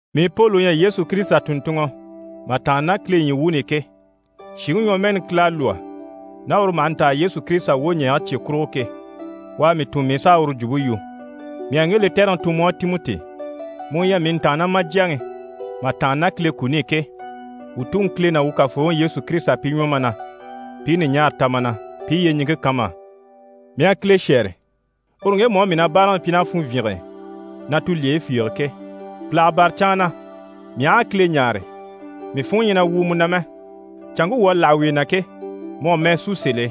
Mii Poli u ɲyɛ Yesu Kirisita tùnntunŋɔ mà tàanna ná Kile ɲyii wuuni i ke, shìŋi ɲwɔmɛɛni Kile à lwɔ́ ná uru maha ntaa Yesu Kirisita wwoɲɛɛge cye kurugo ke, u à mii tun mii u sà a uru jwumpe yu. Mii à ŋge lɛtɛrɛŋi tun mu á Timɔti, mu u ɲyɛ mii ntàannamajyaŋi mà tàanna ná Kile kuni i ke, wuu Tuŋi Kile ná wuu Kafooŋi Yesu Kirisita pi ɲwɔ ma na, pi i ɲùɲaara ta ma na, pi i yyeɲiŋke kan ma á. Mii à Kile shɛ́ɛre, uru ŋgemu á mii na báaraŋi pyi ná funvyinge e, na tulyeyi fiige ke. Pìlaga bâra canŋa na, mii aha a Kile ɲáare, mii funŋɔ ɲyɛ na wwùu mu na mɛ. Canŋke wuu à láha wuye na ke, mu à mɛɛ sú sèl'e,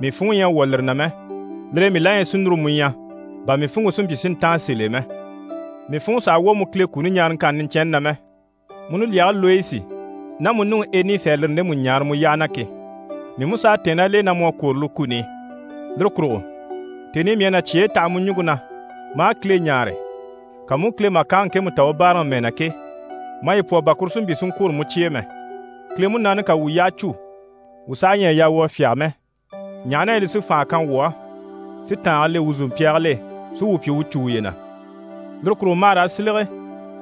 mii funŋɔ ɲyɛ a wwɔ̀ lire na mɛ. Lire e mii la ɲyɛ si núru mu ɲya, bà mii funŋke si mpyi si ntáan sèl'e mɛ. Mii funŋɔ sàha wwɔ̀ mu Kile kuni ɲaaraŋkanni niɲcɛnni na mɛ, mu nulyage Loyisi ná mu nuŋi Enisi à lire ndemu ɲaara mu yyaha na ke. Mii mú s'à tɛ̀ɛn ná l'e na mu à kwôro lire kuni i. Lire kurugo tèni i mii à na cyeyi taha mu ɲùŋke na maa Kile ɲáare, ka mu u Kile màkange ŋkemu ta u báaraŋi mɛɛ na ke, maye pwɔ bà kuru si mpyi si ŋkwôro mu cye e mɛ. Kile Munaani ká wuu yyaha cû, wuu saha ɲyɛ a yaa wuu a fyáge mɛ, ɲaha na yɛ li sí fànha kan wuu á, si tàange le wuu zòmpyaagil'e, si wuu pyi wuu cû wuye na. Lire kurugo ma hà raa silege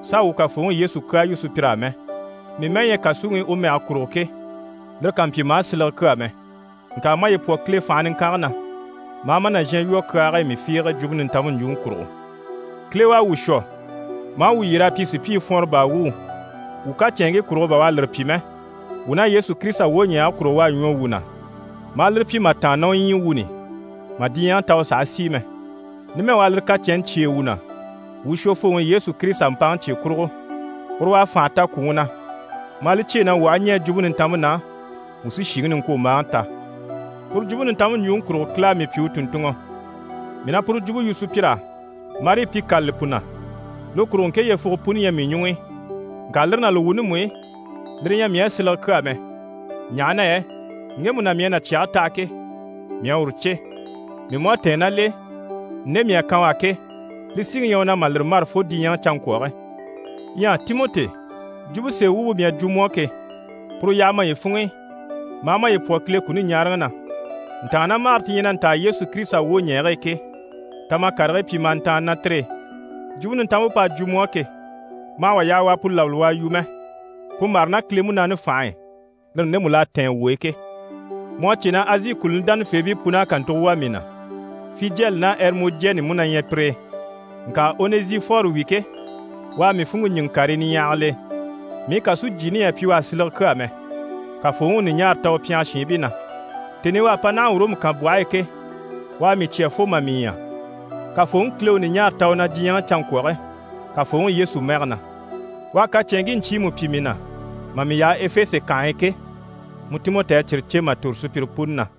s'a wuu Kafooŋi Yesu kyaa yu sùpyir'á mɛ. Mii mɛ́ɛ ɲyɛ kàsuŋi i u mɛge kurugo ke, lire kà mpyi ma á silege kyaa mɛ. Ŋka maye pwɔ Kile fànhe niŋkange na, ma a ma nàzhan lwɔ́ kyaage e mii fiige Jwumpe Nintanmpe ɲjwuŋi kurugo. Kile u à wuu shwɔ, maa wuu yyer'a pyi sùpyii fwɔnrɔ baa wuu. Wuu kacɛnŋkii kurugo bà u à lire pyi mɛ, wuu ná Yesu Kirisita wwoɲɛɛge kurugo, u à ɲwɔ wuu na maa lire pyi mà tàanna ná u ɲyii wuuni i, mà diɲyɛŋi ta u sàha sìi mɛ. Numɛ u à lire kacɛnni cyêe wuu na wuu Shwofooŋi Yesu Kirisita mpaŋi cye kurugo. Uru u à fànha ta kwùŋi na, maa li cyêe na wuu aha ɲɛɛ Jwumpe Nintanmpe na, wuu sí shìŋi niŋkwombaaŋi ta. Puru Jwumpe Nintanmpe ɲjwuŋi kurugo Kile à mii pyi u tùnntunŋɔ. Mii na puru jwumpe yu sùpyir'á marii pi kâlali pu na. Lire kurugo ŋke yyefuge puni ɲyɛ mii ɲuŋ'i. Ŋka lire ná li wuuni mú i, lire ɲyɛ mii á silege kyaa mɛ, ɲaha na yɛ ŋgemu na mii à na cyɛge taha ke, mii à uru cè, mii mú à tɛ̀ɛn ná l'e, nde mii à kan u á ke, li síŋi ɲyɛ u na mà lire mâra fo diɲyɛ canŋkwɔge. Ɲyɛ Timɔti, jwumpe sèe wumpe mii à jwo mu á ke, puru yaha maye funŋ'i, maa maye pwɔ Kile kuni ɲaaraŋi na. Ntàannamagare ti ɲyɛ na ntaa Yesu Kirisita wwoɲɛɛge e ke, ta ma karigii pyi ma a ntàanni ná tire e. Jwumpe Nintanmpe p'à jwo mu á ke, ma hà wà yaha u a pu labali u a yu mɛ. Pu mâra ná Kile Munaani fànhe e, lire ndemu l'à tɛ̀ɛn wuu e ke. Mu à cè na Azi kùluni dánafeebii pun'à kàntugo wà mii na, Fijɛli ná Ɛrimɔjɛni mú na ɲyɛ pire e. Ŋka Onɛzifɔri wi ke, u à mii funŋke ɲíŋɛ karii niɲyahagil'e. Mii kàsujyiini ɲyɛ a pyi u á silege kyaa mɛ. Kafooŋi u ɲùɲaara ta u pyɛngɛ shiinbii na. Tèni i u à pa naha Ɔrɔmu kànbwɔhe e ke, u à mii cya fo mà mii ɲya. Kafooŋi Kile u ɲùɲaara ta u na diɲyɛŋi canŋkwɔge Kafooŋi Yesu mɛge na. U à kacɛnŋkii ɲcyiimu pyi mii na mà mii yaha Efese kànhe e ke, mu Timɔti à cyire cè mà tòro sùpyire puni na.